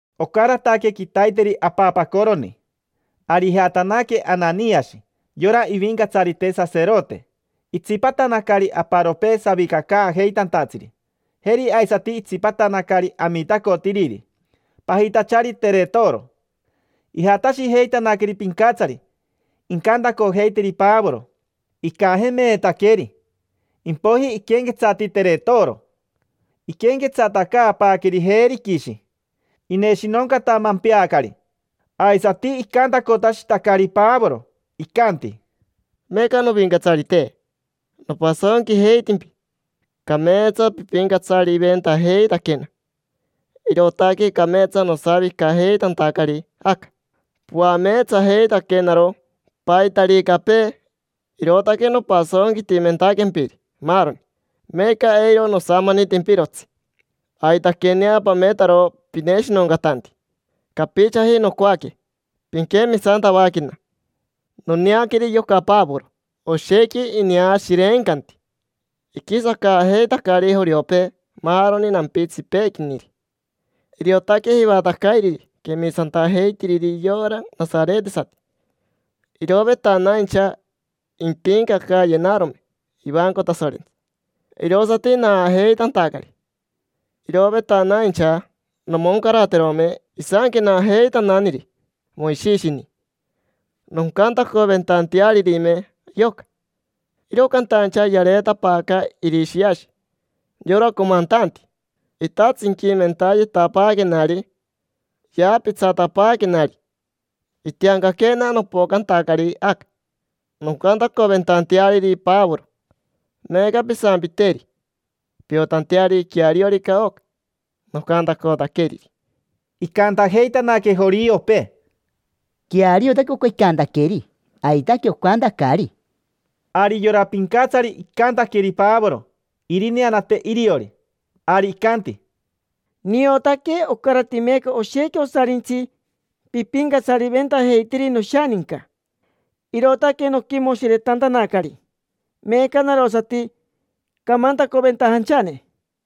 Ocarataque quitaiteri apapacoroni, ari ijatanaque Ananiashi, yora ivincatsarite saserote, itsipatanacari aparopee savicacaajeitantatsiri. Jeri aisati itsipatanacari amitacotiriri, pajitachari Teretoro. Ijatashijeitanaqueri pincatsari, incantacojeiteri Pavoro. Icajemeetaqueri, impoiji iquenquetsati Teretoro. Iquenquetsatacaapaaqueri Virishi, ineshinoncatamempeacari, aisati icantacotashitacari Pavoro, icanti: —Meeca, novincatsarite, nopasonquijeitimpi. Cameetsa pipincatsariventajeitaquena, irootaque cameetsa nosavicajeitantacari aca. Poameetsajeitaquenaro paitaricapee, irootaque nopasonquitimentaquempiri maaroni. Meeca eiro nosamanitimpirotsi. Aitaquenea pametaro pineshinoncatanti, capichaji nocoaque pinquemisantavaquena. Noneaqueri yoca Pavoro, oshequi ineashirencanti. Iquisacaajeitacari joriopee maaroni nampitsipeequiniri. Iriotaque jivatacairiri quemisantajeitiriri yora nasaretesati. Irovetanaincha impincacayenarome ivanco Tasorentsi, irosati naajeitantacari. Irovetanaincha nomoncaraterome isanquenajeitananiri Moishishini, noncantacoventantearirime yoca. Iro cantaincha yareetapaaca Irishiashi, yora comantanti. Itatsinquimentayetapaaquenari, yaapitsatapaaquenari. Itiancaquena nopocantacari aca, noncantacoventanteariri Pavoro. Meeca, pisampiteri, piotanteari queariorica oca nocantacotaqueriri. Icantajeitanaque joriopee: —Queariotaque oca icantaqueri. Aitaque ocantacari. Ari yora pincatsari icantaqueri Pavoro irineanate iriori. Ari icanti: —Niotaque ocarati meeca oshequi osarintsi pipincatsariventajeitiri noshaninca, irootaque noquimoshiretantanacari. Meeca narosati camantacoventajanchane.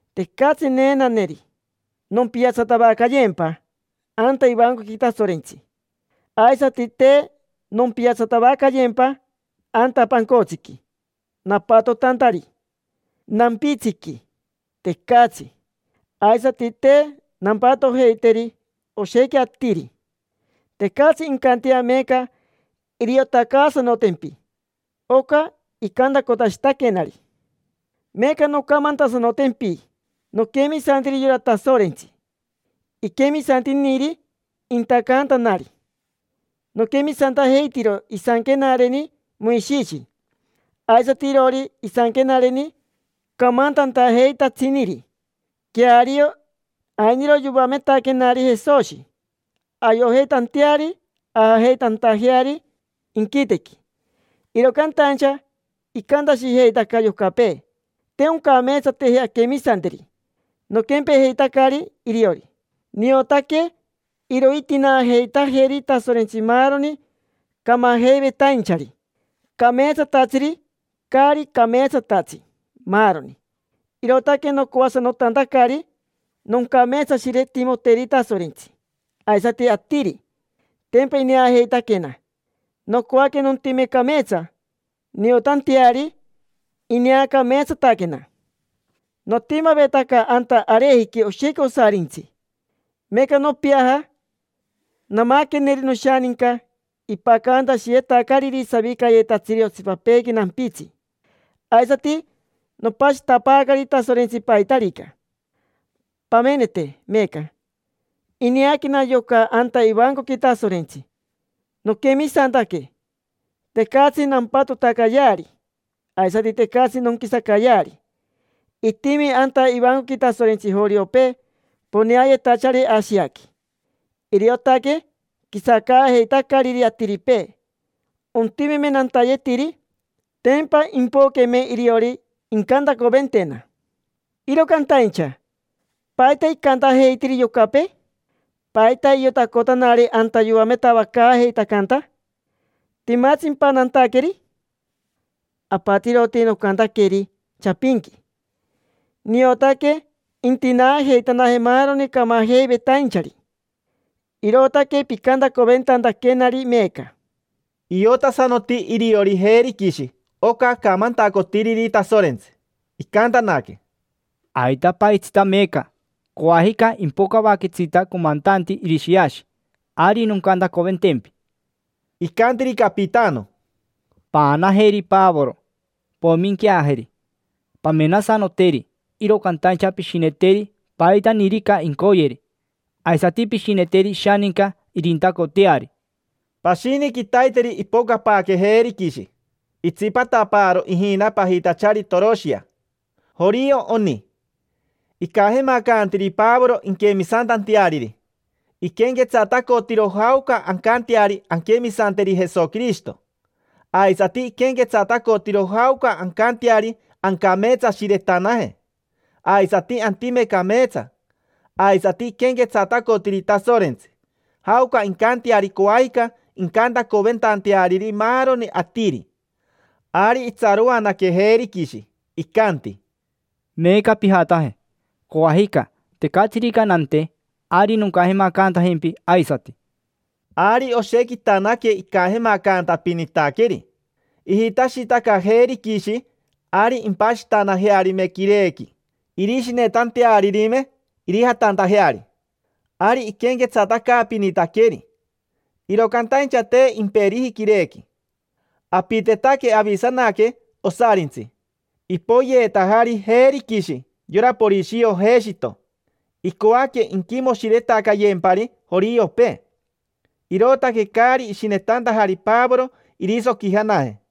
Tecatsi neenaneri nompiatsatavacayempaji anta ivancoqui Tasorentsi, aisati te nompiatsatavacayempa anta pancotsiqui napatotantari, nampitsiqui, tecatsi. Aisati te nampatojeiteri oshequi atiri. Tecatsi incantea meeca iriotacaasanotempi oca icantacotashitaquenari. Meeca noncamantasanotempi. Noquemisantiri yora Tasorentsi iquemisantiniri intacantanari. Noquemisantajeitiro isanquenareni Moishishi, aisati iroori isanquenareni camantantajeitatsiniri. Queario, ainiro yoametaquenari Jesoshi ayojeitanteari ajajeitantajeari inquitequi, iro cantaincha icantashijeitaca yocapee te oncameetsateji anquemisanteri. Noquempejeitacari iriori, niotaque irointinaajeitajeri Tasorentsi maaroni camajeivetainchari: cameetsatatsiri, caari cameetsatatsi, maaroni. Irootaque nocoasanotantacari noncameetsashiretimoteri Tasorentsi, aisati atiri. Tempa ineajeitaquena. Nocoaque nontime cameetsa, niotanteari ineacameetsataquena. Notimavetaca anta arejiqui oshequi osarintsi, meeca nopiaja. Namaqueneri noshaninca ipacantashiyetacariri savicayetatsiri otsipapeequi nampitsi. Aisati nopashitapaacari Tasorentsi paitarica. Pamenete meeca, ineaquena yoca anta ivancoqui Tasorentsi, noquemisantaque. Tecatsi nampatotacayeari, aisati tecatsi nonquisacayeari. Itimi anta ivancoqui Tasorentsi joriopee poneayetachari Ashiaqui, iriotaque quisacaajeitacariri atiripee. Ontimeme nantayetiri, tempa impoqueme iriori incantacoventena. Iro cantaincha ¿paita icantajeitiri yocapee? ¿Paita iotacotanari anta yoametavacaajeitacanta? ¿Timatsimpa nantaqueri? Apatiroti nocantaqueri chapinqui: “Niotaque intinaajeitanaje maaroni camajeivetainchari, irootaque picantacoventantaquenari meeca”. Iotasanoti iriori Virishi oca acamantacotiriri Tasorentsi. Icantanaque: —Aitapaajitsita meeca. Coajica impocavajetsita comantanti Irishiashi, ari noncantacoventempi. Icantiri capitano: —Paanajeri Pavoro, poiminqueajeri: pamenasanoteri, iro cantaincha pishineteri paitanirica incoyeri. Aisati pishineteri ishaninca irintacoteari. Pashini quitaiteri ipocapaaque Virishi. Itsipatapaaro ijina pajitachari Toroshia. Jorio oni. Icajemacantiri Pavoro inquemisantanteariri. Iquenquetsatacotiro jaoca ancanteari anquemisanteri Jesoquirishito. Aisati iquenquetsatacotiro jaoca ancanteari ancameetsashiretanaje, aisati antime cameetsa. Aisati iquenquetsatacotiri Tasorentsi, jaoca incanteari coajicani incantacoventanteariri maaroni atiri. Ari itsaroanaque Virishi. Icanti: —Meeca pijataje. Coajica, tecatsirica nante, ari noncajemacantajempi aisati. Ari oshequitaque icajemacantapinitaqueri, ijitashitaca Virishi ari impashitanajearime quirequi irishinetantearirime irijatantajeari. Ari iquenquetsatacaapinitaqueri, iro cantaincha te imperiji quirequi. Apitetaque avisanaque osarintsi. Ipoyeetajari Virishi yora Porishio Jeshito. Icoaque inquimoshiretacayempari joriopee, irootaque caari ishinetantajari Pavoro irisoquijanaje.